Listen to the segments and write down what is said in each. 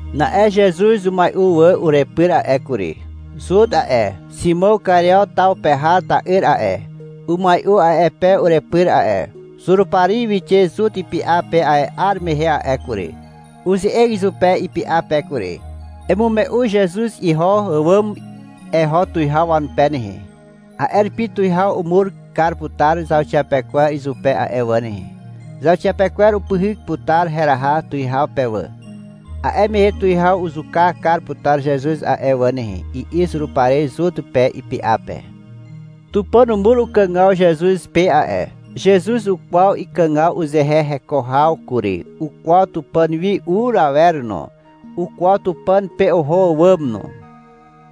Na'e Zezuz umai'u wà urepyr a'e kury. Zut a'e, Ximàw Kario taw pe har ta'yr a'e, umai'u a'e pe urepyr a'e. Zurupari wixe Zut ipy'a pe a'e 'ar mehe a'e kury. Uze'eg izupe ipy'a pe kury. — Emume'u Zezuz iho àwàm eho tuwihaw wanupe nehe. A'e rupi tuwihaw umur kar putar zauxiapekwer izupe a'e wà nehe. Zauxiapekwer upyhyk putar heraha tuwihaw pe wà. A'e mehe tuwihaw uzuka kar putar Zezuz a'e wà nehe, i'i Zurupari Zut pe, ipy'a pe. Tupàn umur ukàgaw Zezuz pe a'e. Zezuz ukwaw ikàgaw uzehe heko haw kury. Ukwaw Tupàn wi ur awer no. Ukwaw Tupàn pe oho àwàm no.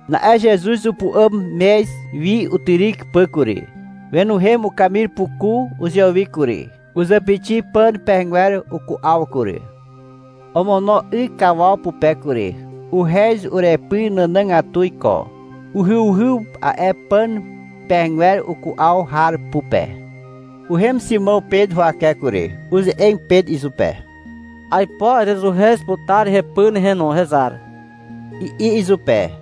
Na'e Zezuz upu'àm mez wi utyryk pà kury. Wenuhem ukamir puku uzewi kury. Uzàpixi pàn pehegwer uku'aw kury. Omono 'y kawaw pupe kury. Uhez urepy nànàgatu iko. Uhyuhyw a'e pàn pehegwer uku'aw har pupe. Uhem Ximàw Pet huwake kury. Uze'eg Pet izupe. — Aipo erezuhez putar hepy nehe no, hezar, i'i izupe.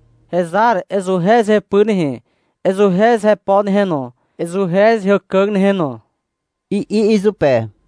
— Hezar. Ezuhez hepy nehe, ezuhez hepo nehe no, ezuhez heàkàg nehe no, i'i izupe.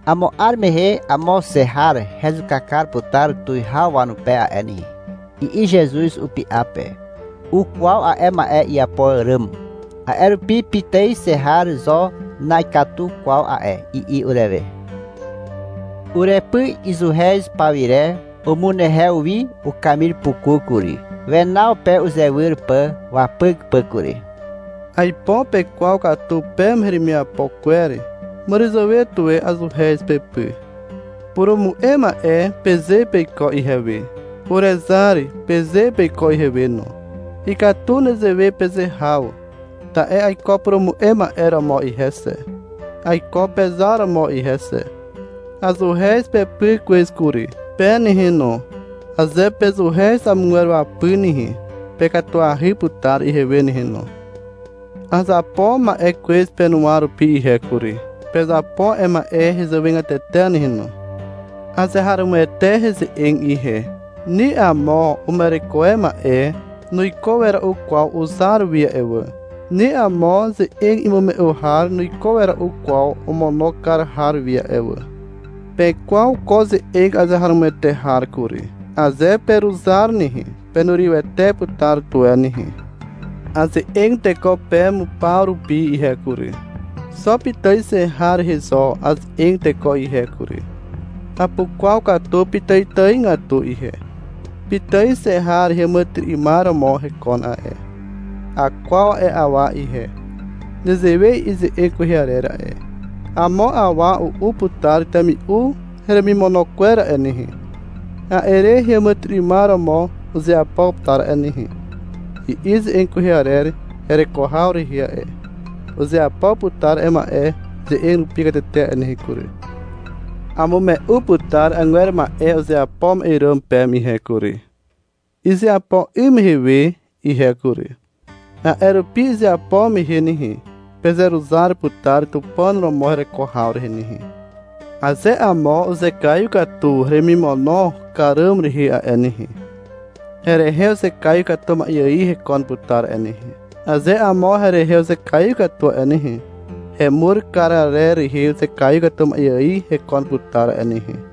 — Amo 'ar mehe amo xe har hezuka kar putar tuwihaw wanupe a'e nehe, i'i Zezuz upy'a pe. Ukwaw a'e ma'e iapo àràm. A'e rupi — Pitài xe har zo na'ikatu kwaw a'e, i'i urewe a'e. Urepy izuhez pawire umunehew wi ukamir puku kury, wenaw pe uzewyr pà wapyk pà kury. — Aipo pekwaw katu peme heremiapo kwer. Màràzàwe tuwe azuhez pepy. — Purumu'e ma'e, peze peiko ihewe. — Urezar, peze peiko ihewe no. Ikatu nezewe peze haw, ta'e aiko purumu'e ma'e romo ihe xe. Aiko pezar romo ihe xe. Azuhez pepy kwez kury. Pe nehe no, aze pezuhez amogwer wapy nehe, pekatuahy putar ihewe nehe no. Azapo ma'e kwez penuwa rupi ihe kury. Pezapo a'e ma'e hezàwegatete nehe no. Azeharomoete heze'eg ihe. Ni amo uma'ereko e ma'e nuiko wera'u kwaw uzar wi a'e wà. Ni amo ze'eg imume'u har nuiko wera'u kwaw omono kar har wi a'e wà. Pekwaw ko ze'eg azeharomoete har kury. Aze peruzar nehe, penurywete putar tuwe nehe. Aze'eg teko peme paw rupi ihe kury. Xo pitài xe har rehe zo aze'eg teko ihe kury. Apukwaw katu pitàitàigatu ihe. Pitài xe har heàmàtyry'ymar romo hekon a'e. Akwaw a'e awa ihe. Nezewe i'i ze'eg kwehe arer a'e. — Amo awa u'u putar temi'u heremimono kwer a'e nehe. A'e re heàmàtyry'ymar romo uzeapo putar a'e nehe, i'i ze'eg kwehe arer hereko haw rehe a'e. Uzeapo putar ma'e a'e ze'eg rupi katete a'e nehe kury. Amume'u putar agwer ma'e uzeapo ma'e ràm peme ihe kury, izeapo 'ym mehe we ihe kury. A'e rupi izeapo mehe nehe, pezeruzar putar Tupàn romo hereko haw rehe nehe. Aze amo uzekaiw katu heremimono kar ràm rehe a'e nehe, herehe uzekaiw katu ma'e ài hekon putar a'e nehe. Aze amo herehe uzekaiw katu a'e nehe, hemur kar arer rehe uzekaiw katu ma'e ài hekon putar a'e nehe.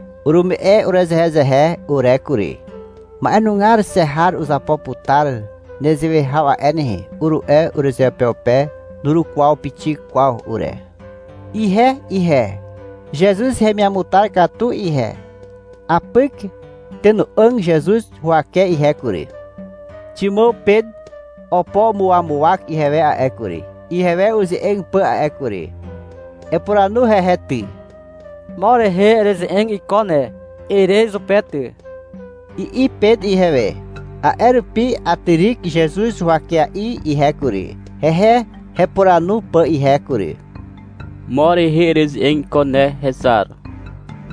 Urume'e urezehezehe ure kury. — Ma'enugar xe har uzapo putar nezewe haw a'e nehe, uru'e urezeupeupe. Nurukwaw pixik kwaw ure. Ihe ihe, (Zezuz hemiamutar katu ihe), apyk tenà'àg Zezuz huwake ihe kury. Ximàw Pet opo umuawawak ihewe a'e kury, ihewe uze'eg pà a'e kury. — Epuranu hehe ty. — Mo rehe ereze'eg iko ne, ere izupe ty, i'i Pet ihewe. A'e rupi atyryk Zezuz huwakea'i ihe kury, hehe hepuranu pà ihe kury. — Mo rehe ereze'eg iko ne, hezar,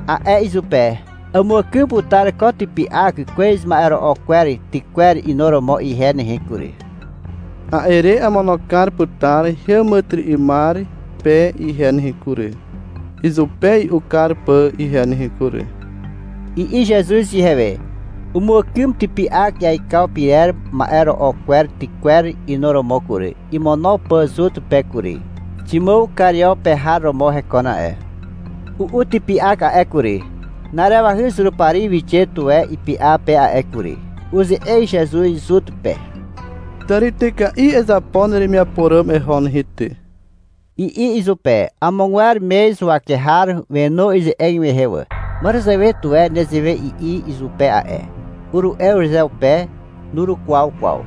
a'e izupe. — Amuàkym putar ko typy'ak kwez ma'ero'o kwer tykwer inuromo ihe nehe kury. A'e re amono kar putar heàmàtyry'ymar pe ihe nehe kury, izupe i'u kar pà ihe nehe kury, i'i Zezuz ihewe. Umuàkym typy'ak iaikaw pyrer ma'e ro'o kwer tykwer inuromo kury, imono pà Zut pe kury. (Ximàw Kario pe har romo hekon a'e.) U'u typy'ak a'e kury. Na'arewahy Zurupari wixe tuwe ipy'a pe a'e kury. Uze'eg Zezuz Zut pe. — Tàrityka'i ezapo neremiapo ràm eho nehe ty, i'i izupe. Amogwer mez huwake har wenu ize'eg mehe wà. — Màràzàwe tuwe nezewe i'i izupe a'e, uru'e urezeupe. Nurukwaw kwaw.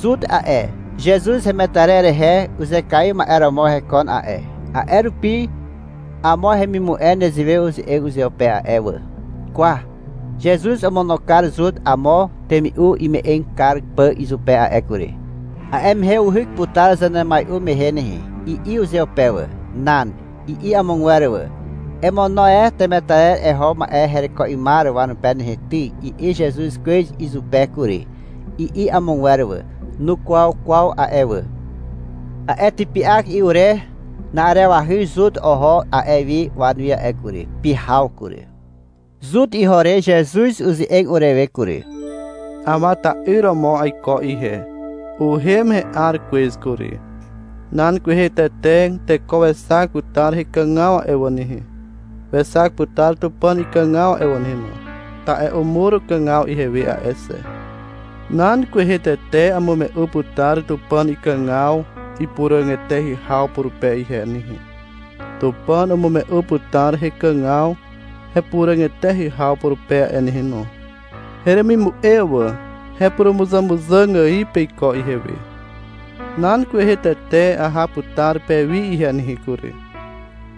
Zut a'e, Zezuz hemetarer rehe uzekaiw ma'e romo hekon a'e. A'e rupi amo hemimu'e nezewe uze'eg uzeupe a'e wà. — Kwa, Zezuz omono kar Zut amo temi'u ime'eg kar pà izupe a'e kury. A'e mehe uhyk putar zanemai'u mehe nehe, i'i uzeupe wà. — Nan, i'i amogwer wà. — Emono e temetarer eho ma'e hereko 'ymar wanupe nehe ty, i'i Zezuz kwez izupe kury, i'i amogwer wà. Nukwaw kwaw a'e wà. A'e typy'ak i'u re na'arewahy Zut oho a'e wi wanuwi a'e kury. Pyhaw kury. Zut iho ire Zezuz uze'eg urewe kury. — Awa ta'yr romo aiko ihe. Uhem he'ar kwez kury. Nan kwehe tete teko wexak putar hekàgaw a'e wà nehe. Wexak putar Tupàn ikàgaw a'e wà nehe no, ta'e umur ukàgaw ihewe a'e xe. Nan kwehe tete amume'u putar Tupàn ikàgaw ipuràg eteahy haw purupe ihe nehe. Tupàn umume'u putar hekàgaw hepuràg eteahy haw purupe a'e nehe no. Heremimu'e wà, hepurumuzàmuzàg ài peiko ihewe. Nan kwehe tete aha putar pewi ihe nehe kury.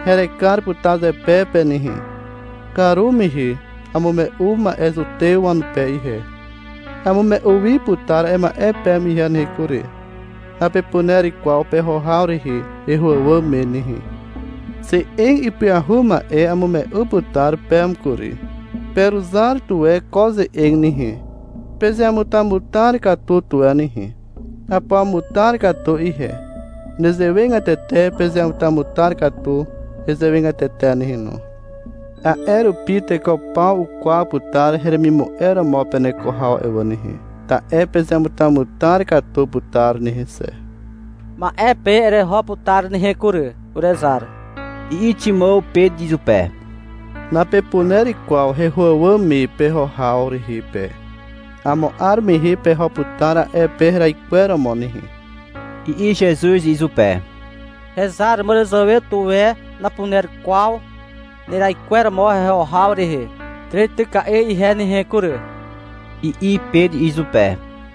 Herekar putar zepe pe nehe. Karumehe amume'u ma'e Zutew wanupe ihe. Amume'u wi putar a'e ma'e peme ihe nehe kury. — Napepuner kwaw peho haw rehe heho àwàm me nehe. Ze'eg ipyahu ma'e amume'u putar peme kury. Peruzar tuwe ko ze'eg nehe. — Pezeamutamutar katu tuwe nehe. Apuamutar katu ihe, nezewegatete pezeamutamutar katu hezàwegatete nehe no. A'e rupi teko paw ukwaw putar heremimu'e romo peneko haw a'e wà nehe. Ta'e pezeamutamutar katu putar nehe xe. — Ma'e pe ereho putar nehe kury, urezar, i'i Ximàw Pet izupe. — Napepuner kwaw heho àwàm me peho haw rehe pe. Amo 'ar mehe peho putar a'e pe heraikweromo nehe, i'i Zezuz izupe. — Hezar, màràzàwe tuwe napuner kwaw neraikweromo heho haw rehe tàrityka'i ihe nehe kury, i'i Pet izupe.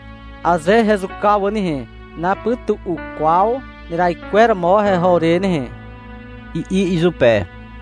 — Aze hezuka wà nehe, napytu'u kwaw neraikweromo heho re nehe, i'i izupe.